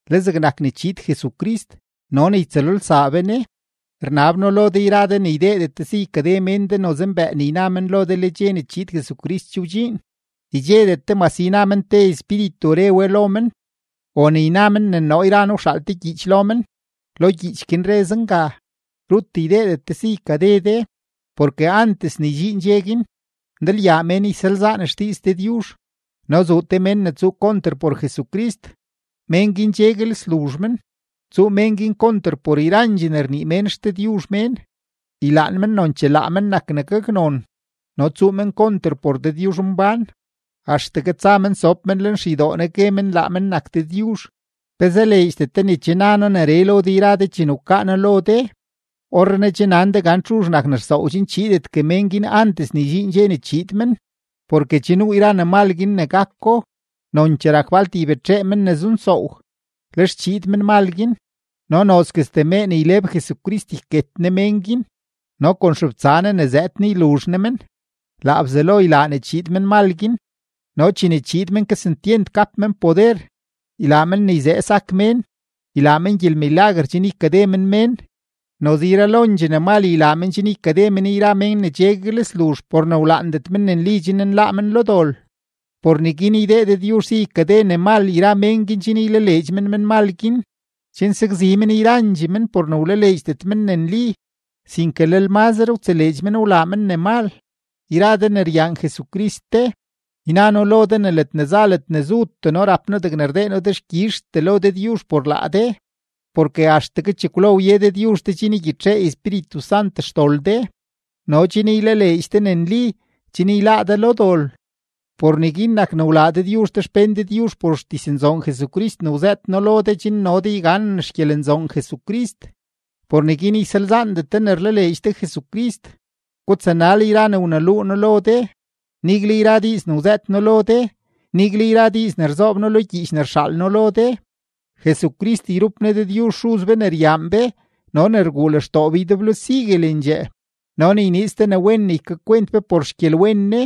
Le zegnak ne chiid Jesucrist no ne ytsëlolsaa be Ne, rnab noo lo de yra de ne ydeedet de si ykade mén de noze mbëë ne yna men lo de le dxe ne chiid Jesucrist che wdxiin, ydxedet de mase yna men te espíritu re we lo men o ne yna men ne noo yra noo wxaal te gyiich lo men, lo gyiich guin re zenga. Rut ydeedet de si ykade de. Porke antes ne ydxiin dxe guin, ndalyaa mén ysalzaan xdiiz Dëdyuzh no zuu te mén ne tsuu konter por Jesucrist, mén guin cheguel sluzh men. Tsuu mén guin konter por yrandxee ne rnii mén xdëdyuzh mén. Ylaan men nonchee laa men nak ne gaknon, no tsuu men konter por Dëdyuzhmbán, axtegue tsa men sob men lenxeydoo Ne gue men laa men nak Dëdyuzh. ¿Pe zaleedxdet de ne che na noo neree lo de yra de chene wkaa noo lo de? Orrenaa che nan de gan txuzh nak ne rsoow chen chiidetgue men guin antes ne ydxiin dxe ne chiid men. Porke che nuu yra ne mal guin ne gako, nonchee rak falt ybetxee men ne zunsoow. Lex chiid menmal guin, no nozguestee mee ne yleb Jesucrist yket Ne mén guin no kon xebtsa Ne ne zëëd Ne yluzh Ne men. Laa Bzelo ylaa ne chiid menmal guin no chene chiid men kesentyent gap men poder, ylaa men ne yzee sak mén, ylaa men gyelmilaguer chen ykade men mén, noze yralondxee ne mal ylaa men chen ykade men yra mén ne cheguel sluzh por ne wlaandet men ne nli chen nláá men lo dol. Por neguin ydee Dëdyuzh si ykade ne mal yra mén guin chen ylaleedx men menmal guin, chen sakzi men yrandxee men por ne wlaleedxdet men ne nli, sinke lel mazre wtseleedx men wlaa men ne mal. Yra de ne ryaan Jesucrist de, yna noo lo de ne ledne za ledne zutee noo rap noo degne rdee noo dexkyizhtee lo Dëdyuzh por laa de, porke axtegue chekwlo wye Dëdyuzh de chen ygyitxee Espíritu Sant xdol de no chen ylaleedx de ne nli, chen yláá de lo dol. Por neguin nak ne wlaa Dëdyuzh de xpén Dëdyuzh por xdiznzoon Jesucrist ne wzëët noo lo de chen no de yganen xgyelenzoon Jesucrist. Por neguin ysalzaandet de ne rlaleedx de Jesucrist, gutsanal yra ne wneluu noo de, nigle yra diiz ne wzëët noo lo de, nigle yra diiz ne rzoob noo lo gyiich ne rxaal noo lo de. Jesucrist yrup Ne Dëdyuzh Xuz be ne ryaan be no ne rguu lextoo be ydeblo siguelendxee no ne yniiz te ne wen ne ykakwent be por xgyelwen Ne,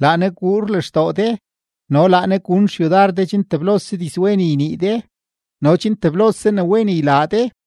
laa Ne guur lextoo de no laa Ne gun xyudar de chen teblose dizwen ynii de no chen teblose ne wen ylaa de.